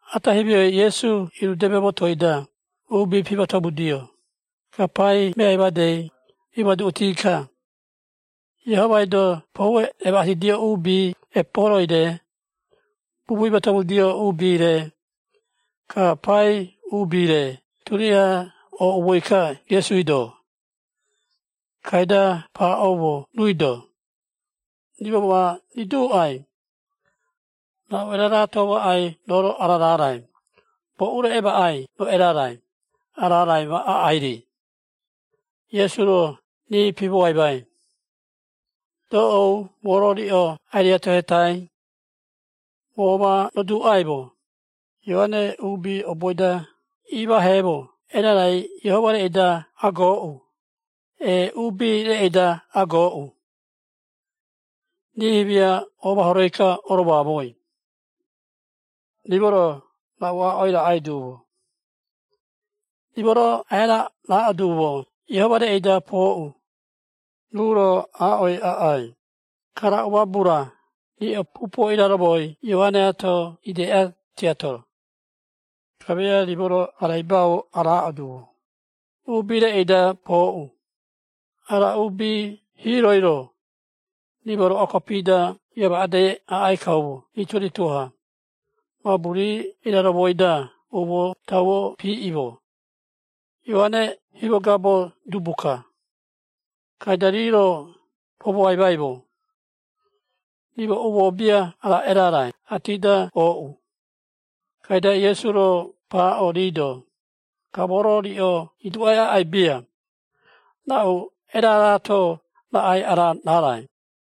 Ata himioi Iesu irudeme motoi-da uubi pimatomudio, ka pai meai madei imoaduꞌuti-ka, Iehomai-do poue emaꞌatidio uubi epuuhoroiꞌoi-re, bubui imatomudio uubi-re, ka pai uubi-re turiaha ooꞌumoi-ka Iesui-do. Kaida paaꞌoumo ruui-do, “Rimo ma riduuꞌai, raꞌu eraraato maꞌai roo-ro ara raarai? Boꞌu-ro emaꞌai roo erarai, ara raarai ma aꞌai-ri?” Iesu-ro rii pimoaimai, “Doꞌou moo-ro riꞌo ai-riatohetai, moo ma roduuꞌaimo, Ioare uubi oboi-da imaaheemo erarai Iehoma reꞌei-da agooꞌu, ee, uubi reꞌei-da agooꞌu?” Rii himia-ro omahoroi-ka oromoamoi, “Rimo-ro raꞌu aaꞌoi raꞌai duumo? Rimo-ro aia raaꞌo duumo, ‘Iehoma reꞌei-da pooꞌu,’ ruu-ro aaꞌoi aꞌai, ‘Ka raꞌu mabu-ra riꞌo pupuo iraromoi Ioareato ideꞌa, tiato?’ Kamia rimo-ro araibau araaꞌo duumo, ‘Uubi reꞌei-da pooꞌu,’ ara uubi hiiroi-ro, rimo roꞌoa kopi-da iamaꞌadei aꞌai kaumo rituo-rituo-ha, mabu rii iraromoi-da umoo tauo piiꞌimo, Ioare himogabo dubu-ka.” Kaida rii-ro pomoaimaimo, “Rimo umoo bia ara erarai aati-da ooꞌu.” Kaida Iesu-ro paaꞌo rii-do, “Ka moo-ro riꞌo iduuꞌai aꞌai bia, raꞌu eraraato raꞌai ara raarai.”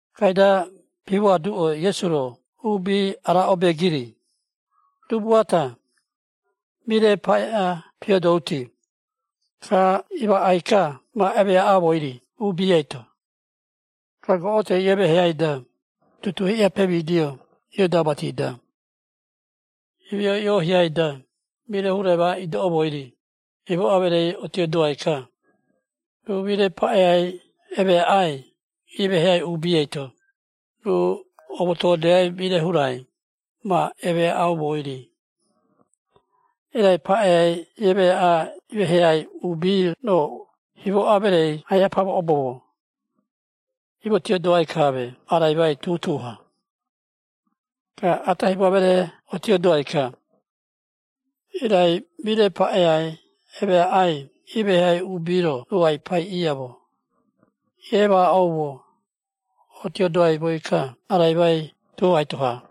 Kaida pimoaduꞌo Iesu-ro uubi ara obeegiri, “Dubu ata, mire paꞌea pioodouti, ka imaꞌai-ka ma emeaꞌaumoi-ri uubi eito, ka goꞌotoi iemeheai-da, tutuu hiꞌa-ha pemidio iodau mati-da. Himioi iohiai-da mire hurai ma idoꞌoumoi-ri, himoꞌa mereei otiodoai-ka, ruu mire paꞌeai emeaꞌai imeheai uubi eito, ruu omotoodeai mire hurai ma emaꞌaimoi-ri, irai paꞌeai emeeꞌai imeheai uubi-ro himoꞌa mereei ai-pamoꞌoboumo, imotiodoaimo araimai tuhaito-ha. Ka ata himoꞌa mereei otiodoai-ka, irai mire paꞌeai emeaꞌai imeheai uubi-ro ai-paiꞌiaumo, iemaꞌaumo, otiodaimoi-ka araimai tuhaito-ha.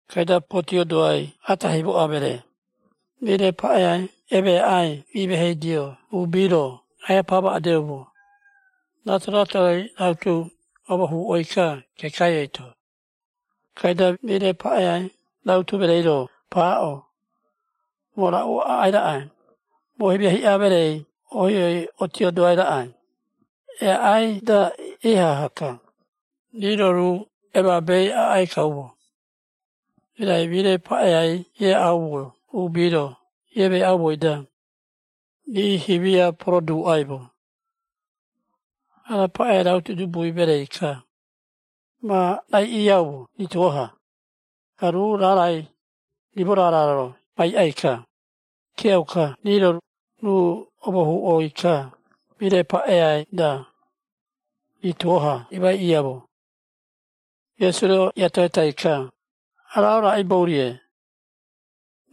Kaida potiodoai ata himoꞌa mereei, mire paꞌeai emeaꞌai imeheidio uubi-ro aiha pamaꞌadeumo, rato-ratoi rautu omohuꞌoi-ka kekai eito. Kaida mire paꞌeai rautu mereei-ro paaꞌo, ‘Moo raꞌu aꞌai raꞌai? Moo himia hiꞌa meree ohioi otiodoai raꞌai, eaꞌai-da ihaha-ka, rii-ro ruu emaabei aꞌai kaumo.’ Irai mire paꞌeai eaꞌaumo uubi-ro iemeeꞌaumoi-da, rii himia poroduuꞌaimo, ‘Ara paꞌeai rautu dubui mereei-ka, ma raiꞌiaumo rituo-ha, ka ruu raarai, rimo raara-ro ma iiꞌai-ka.’ Kiauka rii-ro, ruu omohuꞌoi-ka, mire paꞌei-da, rituo-ha imaiꞌiaumo.” Iesu-ro iatohetai-ka, “Ka raꞌaibou-rie,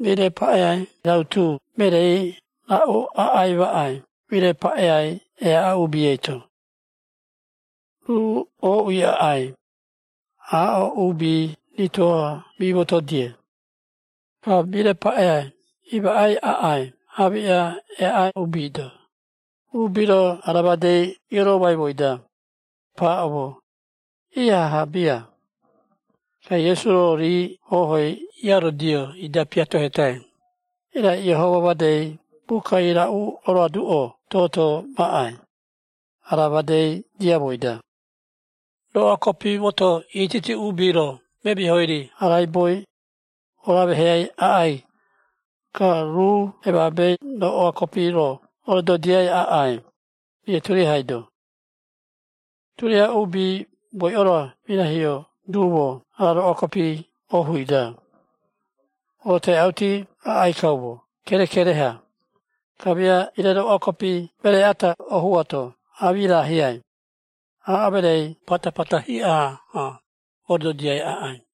mire paꞌeai rautu mereei raꞌu aꞌai maꞌai mire paꞌeai eaꞌa uubi eito? Ruu ooꞌui aꞌai, aaꞌo uubi rituo-ha mimoto-die, ka mire paꞌeai imaꞌai aꞌai aamiꞌa eaꞌa uubi-do.” Uubi-ro ara madei ioromaimoi-da, kaida paaꞌoumo, “Ihaha bia!” Ka Iesu-ro rii hohoi iarodio ida piatohetai, “Irai Iehoma made bukai raꞌu oroaduꞌo toto maꞌai, ara made diamoi-da? ‘Roꞌoa kopi moto ititi uubi-ro memihoi-ri araiboi, oroameheai aꞌai, ka ruu emaabe roꞌoa kopi-ro orododiai aꞌai, rii turiahai-do.’ Turiaha uubi boiꞌo-ro mirahio duumo ara roꞌoa kopi hoꞌui-da, orotoeꞌauti aꞌai kaumo kerekere-ha, kamia ire roꞌoa kopi meree ata hoꞌu ato amirahiai, aaꞌo mereei patapata hiꞌa-ha ododiai aꞌai.”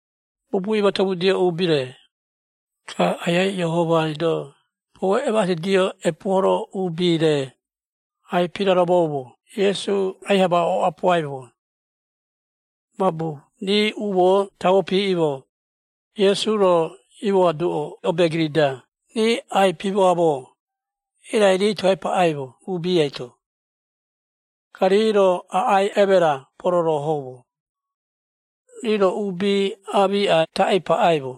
Bubui imatomudio uubi-re, ka Aiai Iehomai-do poue emaꞌatidio epuuhoro uubi-re, ai-piraromoumo Iesu aiha ma oꞌapuaimo. Mabu rii umoo tauo piiꞌimo, Iesu-ro iimoaduꞌo obeegiri-da rii ai-pimooꞌamo, irai rii toe paꞌaimo uubi eito. Ka rii-ro aꞌai emera pororohoumo. Rii-ro uubi aamiꞌa taꞌii paꞌaimo,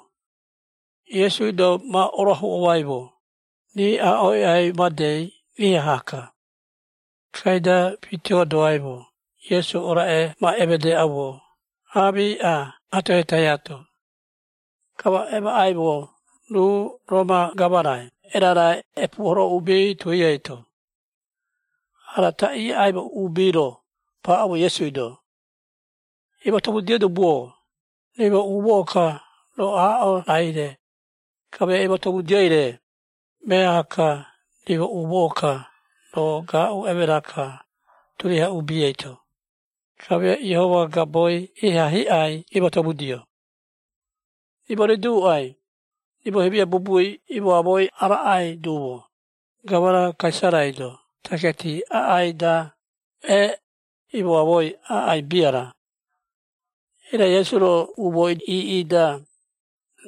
Iesui-do ma orooahuꞌomaimo, rii aaꞌoi aꞌai madei iaha-ka. Kaida pitiodoaimo Iesu oraꞌe ma emedeꞌaumo aamiꞌa atohetaiato. Ka ma emaꞌaimo ruu Roma Gamarai erara aꞌai epuuhoro uubi tui eito. Ara taꞌii iaꞌaimo uubi-ro paaꞌoumo Iesui-do, “Imatomudio Dubu-o, rimo umoo-ka roo aaꞌo raai-re, kamia imatomudioi-re, meaha-ka, rimo umoo-ka roo gaaꞌu emera-ka turiaha uubi eito, kamia Iehoma gaboi iha hiꞌai imatomudio. Rimo riduuꞌai, rimo himia bubui imoamoi araꞌai duumo, Gamara Kaisarai-do taketi aꞌai-da, ee, imoamoi aꞌai bia-ra?” Irai Iesu-ro umooi iiꞌi-da,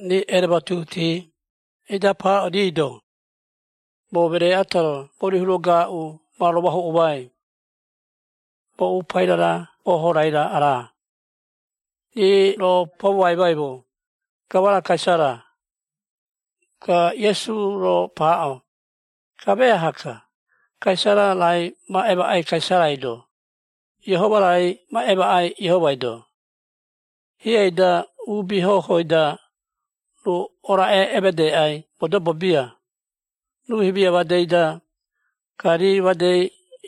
rii erematuhuti, ida paaꞌo rii-do, “Moo meree ata-ro mori hura gaaꞌu ma romoahuꞌomai. Boꞌu paira-ra hoho-rai-ra ara?” Rii-ro pomoaimaimo, “Gamara Kaisara.” Ka Iesu-ro paaꞌo, “Ka meaha-ka, Kaisara raai ma emaꞌai Kaisarai-do, Iehoma raai ma emaꞌai Iehomai-do.” Hieꞌei-da uubi hohoi-da, ruu oraꞌe emedeꞌai modobo bia, ruu himia madei-da, ka rii madei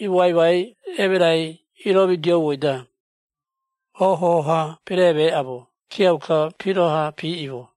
iimoaimai emerai ioromidioumoi-da, hoho-ha peremeꞌaumo kiauka piroha piiꞌimo.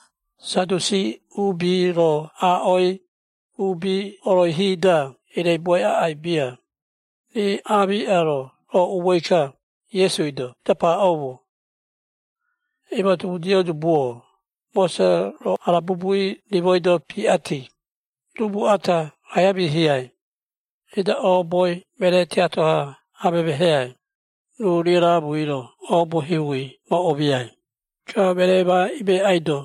Sadusi uubi-ro aaꞌoi, uubi oroihi-da ireibuai aꞌai bia, rii amiꞌa-ro ooꞌumoi-ka Iesui-do ida paaꞌoumo, “Imatomudio dubu-o, Mose-ro ara bubui rimoi-do piꞌati, ‘Dubu ata aia miihiai, ida ooboi meree tiato-ha amemeheai, ruu riaraamui-ro oobo himui ma omiai, ka meree ma imeꞌaido,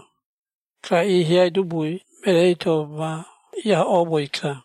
ka iihiai dubui mereei-to ma iahoꞌoumoi-ka.’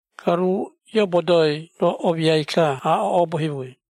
Ka ruu iobodoi-ro omiai-ka aaꞌo oobo himui.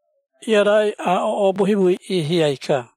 Iarai aaꞌo oobo himui iihiai-ka.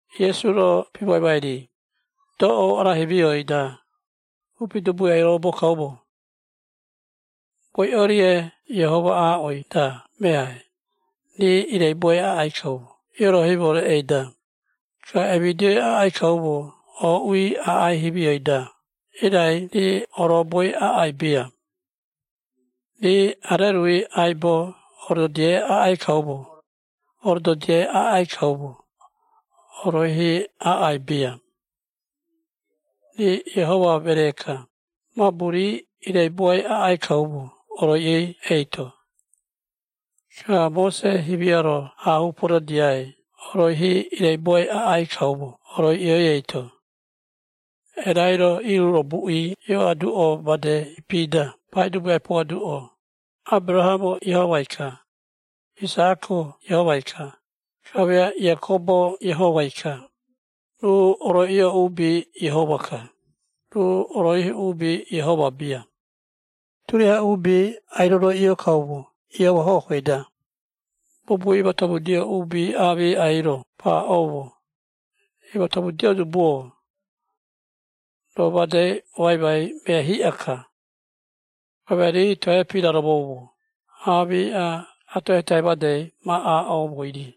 Iesu-ro pimoaimai rii, “Doꞌou ara himioi-da, upi dubui ai-orobo kaumo. Boiꞌo-rie Iehoma aaꞌoi-da meai, rii ireibuai aꞌai kaumo ioroihimo reꞌei-da, ka emidioi aꞌai kaumo ooꞌui aꞌai himioi-da, irai rii oroboi aꞌai bia. Rii arerui aibo orododiai aꞌai kaumo, oroihi aꞌai bia. Rii Iehoma meree-ka, mabu rii ireibuai aꞌai kaumo oroiꞌioi eito. Ka Mose himia-ro aahuu pododiai oroihi ireibuioi aꞌai kaumo oroiꞌioi eito. Erai-ro iiruro buꞌi ioaduꞌo made ipi-da Paidubu ai-poaduꞌo, ‘Aberahamo Iehomai-ka, Isaꞌako Iehomai-ka, kamia Iakobo Iehomai-ka.’ Ruu oroiꞌio uubi Iehoma-ka, ruu oroihi uubi Iehoma bia, turiaha uubi ai-roroiꞌio kaumo Iehoma hohoi-da.” Bubui imatomudio uubi aamiꞌai-ro paaꞌoumo, “Imatomudio Dubu-o! Roo madei oaimai mea hiꞌa-ka.” Kamia rii toe piraromoumo aamiꞌa atohetai made ma aaꞌoumoi-ri.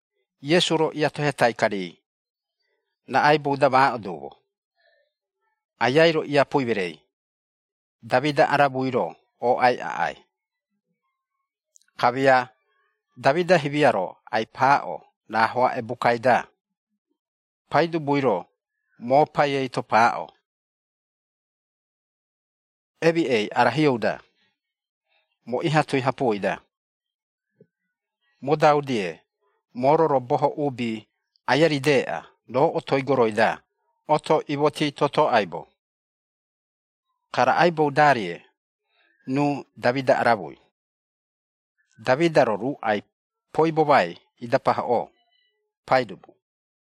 Iesu-ro iatohetai-ka rii, “Raꞌaibou-da maaꞌo duumo, Aiai-ro iapui mereei, Damida aramui-ro ooꞌai aꞌai? Kamia Damida himia-ro ai-paaꞌo rahoaꞌe bukai-da, ‘Paidubui-ro, moo Pai eito paaꞌo, “Emiꞌei ara hioꞌou-da, moo iha-tui hapuoi-da, modau-die moo-ro roo boho uubi aia rideꞌa roo otoi goroi-da oto imoti toto aibo”’ Ka raꞌaibou-darie ruu Damida aramui? Damida-ro ruu ai-poibomai ida pahoꞌo, ‘Paidubu.’”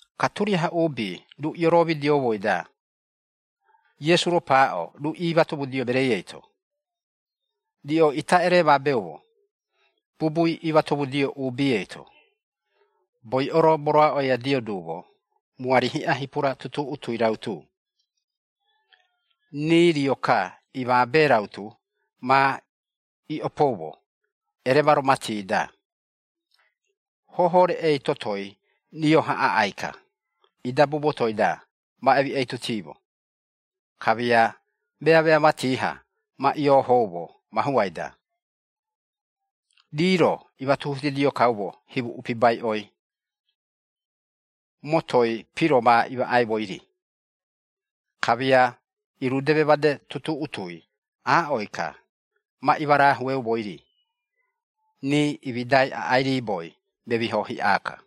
Ka turiaha uubi ruu ioromidioumoi-da, Iesu-ro paaꞌo ruu iimatomudio mereei eito, “Riꞌo ita eremabeumo bubui imatomudio uubi eito, boiꞌo-ro moroaꞌoiadio duumo muari hiꞌa hipura tutuꞌutui rautu, rii rio-ka imaabe rautu ma iꞌopoumo eremaro mati-da. Hoho reꞌei totoi rio-ha aꞌai-ka, idabu motoi-da ma emiꞌeitutimo, kamia meamea mati-ha ma iiohoumo mahuai-da. Rii-ro imatuhutidio kaumo himu upibaiꞌoi, motoi piro ma imaꞌaimoi-ri. Kamia irudeme made tutuꞌutui aaꞌoi-ka ma imarahueumoi-ri! Rii imidai aꞌai riiboi memiho hiꞌa-ka!”